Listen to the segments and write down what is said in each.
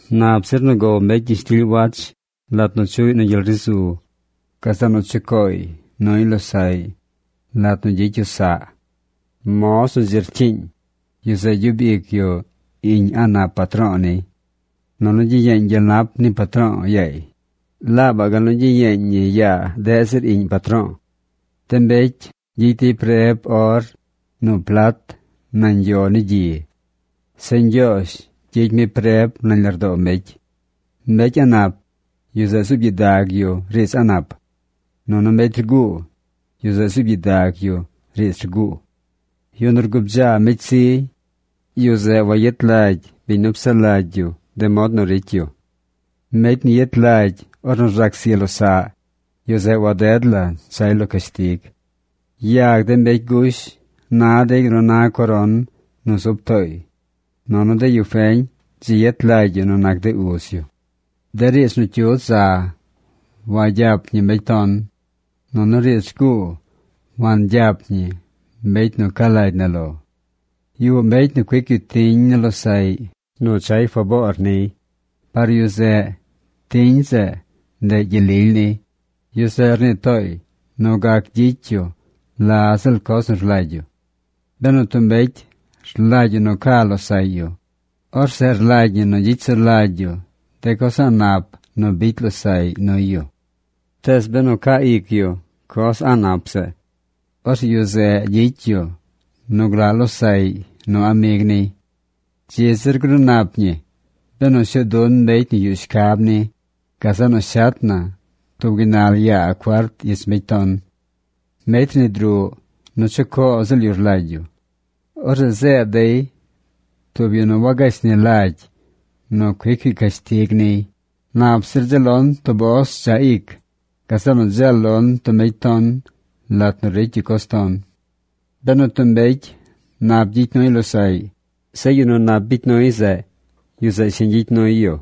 Nap zir nu gow mbecy gyishtily wach lat nu chuꞌy nu gyel ri zu, gazeꞌ nu chucooy nuy losaꞌy lat nu gyicy yu saꞌ. Moz nu dzi cyiiñ, yu zeꞌ gyub ic yu iꞌñ a̱ꞌ nap patro̱o̱ niy. Nunu gyiyeeñ gyel nap ni patro̱o̱ yaay laabaꞌ gal nu gyiyeeñ ñi yaa deꞌ zir iꞌñ patro̱o̱. De mbecy gyicy dey preb or nu plat nañ yo ni gyi. Zeꞌ Ñgyoozh gyicy mi preb nañ lardoo mbecy. Mbecy a̱ꞌ nap, yu zeꞌ zuub gyidag yu riidz a̱ꞌ nap, nunu mbecy rguu, yu zeꞌ zuub gyidag yu riidz rguu. Yu nu rgubdzaa mbecy zi, yu zeꞌ wayet lagy biñ nu psaꞌ lagy yu de mod nu ricy yu. Mbecy nu yet lagy ornu rzac zi losaꞌ, yu zeꞌ waded la chay lo cashtig. Yag de mbecy gush na dey gal nu na coron nu zub tooy. Nunu de yu feñ dzi yet lagy yu nu nac de uz yu. De riidz nu cyudz za wagyap ñi mbecy ton. Nunu riidz rguu wangyap ñi mbecy nu ca lagy na lo. Yuꞌ mbecy nu cuic yu tiñ ni losaꞌy nu chay faboor niy. Par yu zeꞌ tiñ zeꞌ, ndeꞌ gyel lily niy. Yu zeꞌ rnii tooy nu gac gyicy yu la ziꞌl coz nu rlagy yu. Benu tub mbecy rlagy yu nu ca losaꞌy yu, orzeꞌ rlagy ñi nu gyicy sulagy yu de coz a̱ꞌ nap nu bicy losaꞌy nuy yu. Tees benu caa ic yu coz a̱ꞌ nap zeꞌ, orzeꞌ yu zeꞌ gyicy yu nu glaꞌ losaꞌy nu amig niy. Dzi zir gruu nap ñi benu shuu dun mbecy nu yuꞌ shcab ni, gazeꞌ nu shet na tub gaynal yaa cuart ich mbecy ton. Mbecy rnid ruꞌ nu chucoo ziꞌl yu rlagy yu. Orzeꞌ zeed dey tub yu nu wagashni lagy nu cuic yu cashtig niy. Nap zir dzeel lon tub os dzaꞌ ic gazeꞌ nu dzeel lon tub mbecy ton lat nu ricy yu coz ton. Benu tub mbecy nap gyicy nuy losaꞌy, zeꞌ yu nu nap bicy nuy zeꞌ, yu zeꞌ shiñ gyicy nuy yu,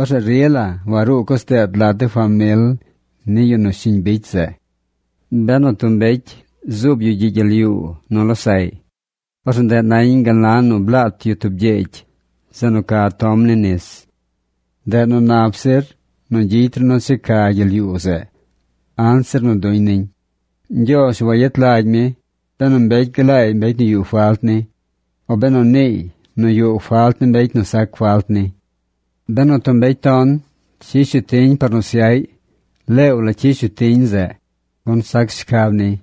orzeꞌ rila waruu coz deet lat de famil ni yu nu shiñ bicy zeꞌ. Benu tub mbecy zuub yu gyiꞌ gyel yuu nu losaꞌy, orzeꞌ ndeꞌ nañ gal na nu blaat yu tub gyegy zeꞌ nu ca tom ni nis. Ndeꞌ nu nap zir nu gyicy ru nu checa gyel yuu zeꞌ anzir nu duñ niñ. Ñgyoozh wayet lagy mi benu mbecy glaay mbecy nu yuꞌ falt ni, o benu niiy nu yuꞌ falt ni mbecy nu sac falt ni. Benu tub mbecy ton cyish yu tiñ par nu syaꞌy, leew la cyish yu tiñ zeꞌ, gun sac shcab niy.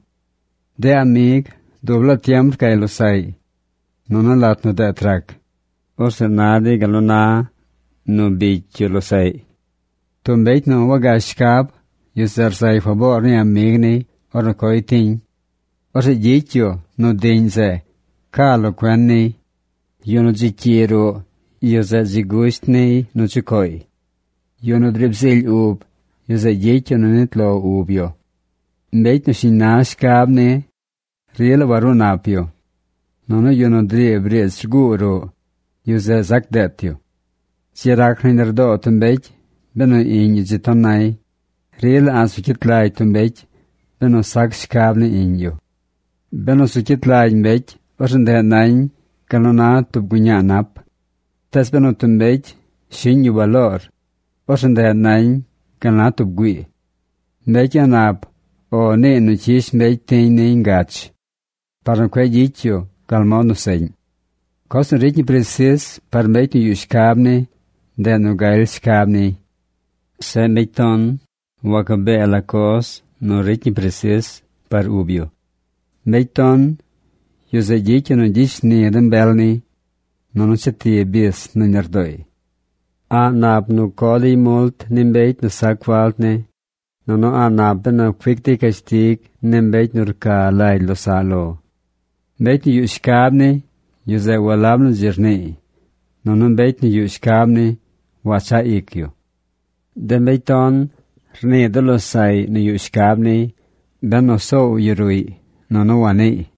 De amig dub laa tiem rcay losaꞌy. Nunu lat nu deet rac, orzeꞌ na dey gal nu na bicy yu nu losaꞌy. Tub mbecy nu wagash shcab, yu zeꞌ rzay faboor ni amig niy ornu coy tiñ. Orzeꞌ gyicy yu nu diꞌñ zeꞌ ca lo cuen niy. Yu nu dzi cyi ruꞌ, yu zeꞌ dzi gusht niy nu chucooy. Yu nu driib zily ub, yu zeꞌ gyicy yu nu nit lo ub yu. Mbecy nu shiñ na shcab ni rila waruu nap yu. Nunu yu nu driib riidz rguu ruꞌ, yu zeꞌ zac deet yu. Dzi rac nañ lardoo tub mbecy benu iꞌñ yu dzi ton nay. Rila a̱ꞌ zu cyit lagy tub mbecy benu sac shcab ni iꞌñ yu. Benu zu cyit lagy mbecy, orzeꞌ ndeꞌ nañ gal nu na tub guñaa nap. Tees benu tub mbecy shiꞌñ yu baloor, orzeꞌ ndeꞌ nañ gal na tub güii. Mbecy a̱ꞌ nap “O”, niiy nu cyish mbecy tiñ niy ngach par nu cueꞌ gyicy yu gal mod nu seꞌñ. Coz nu ricy ñi presis par mbecy nu yuꞌ shcab ni, ndeꞌ nu galy shcab niy. Zeꞌ mbecy ton wacabee la coz nu ricy ñi presis par ub yu. Mbecy ton, yu zeꞌ gyicy yu nu gyicy shni de mbel niy, nunu cheti bis nañ lardooy. A̱ꞌ nap nu co dey mult ni mbecy nu sac falt ni, nunu a̱ꞌ nap benu cuic dey cashtig ni mbecy nu rca lagy losaꞌ lo. Mbecy nu yuꞌ shcab ni, yu zeꞌ walab nu dzi rniiy. Nunu mbecy nu yuꞌ shcab ni, wachaꞌ ic yu. De mbecy ton rnii de losaꞌy nu yuꞌ shcab niy benu soow yu ruꞌy nunu waniiy.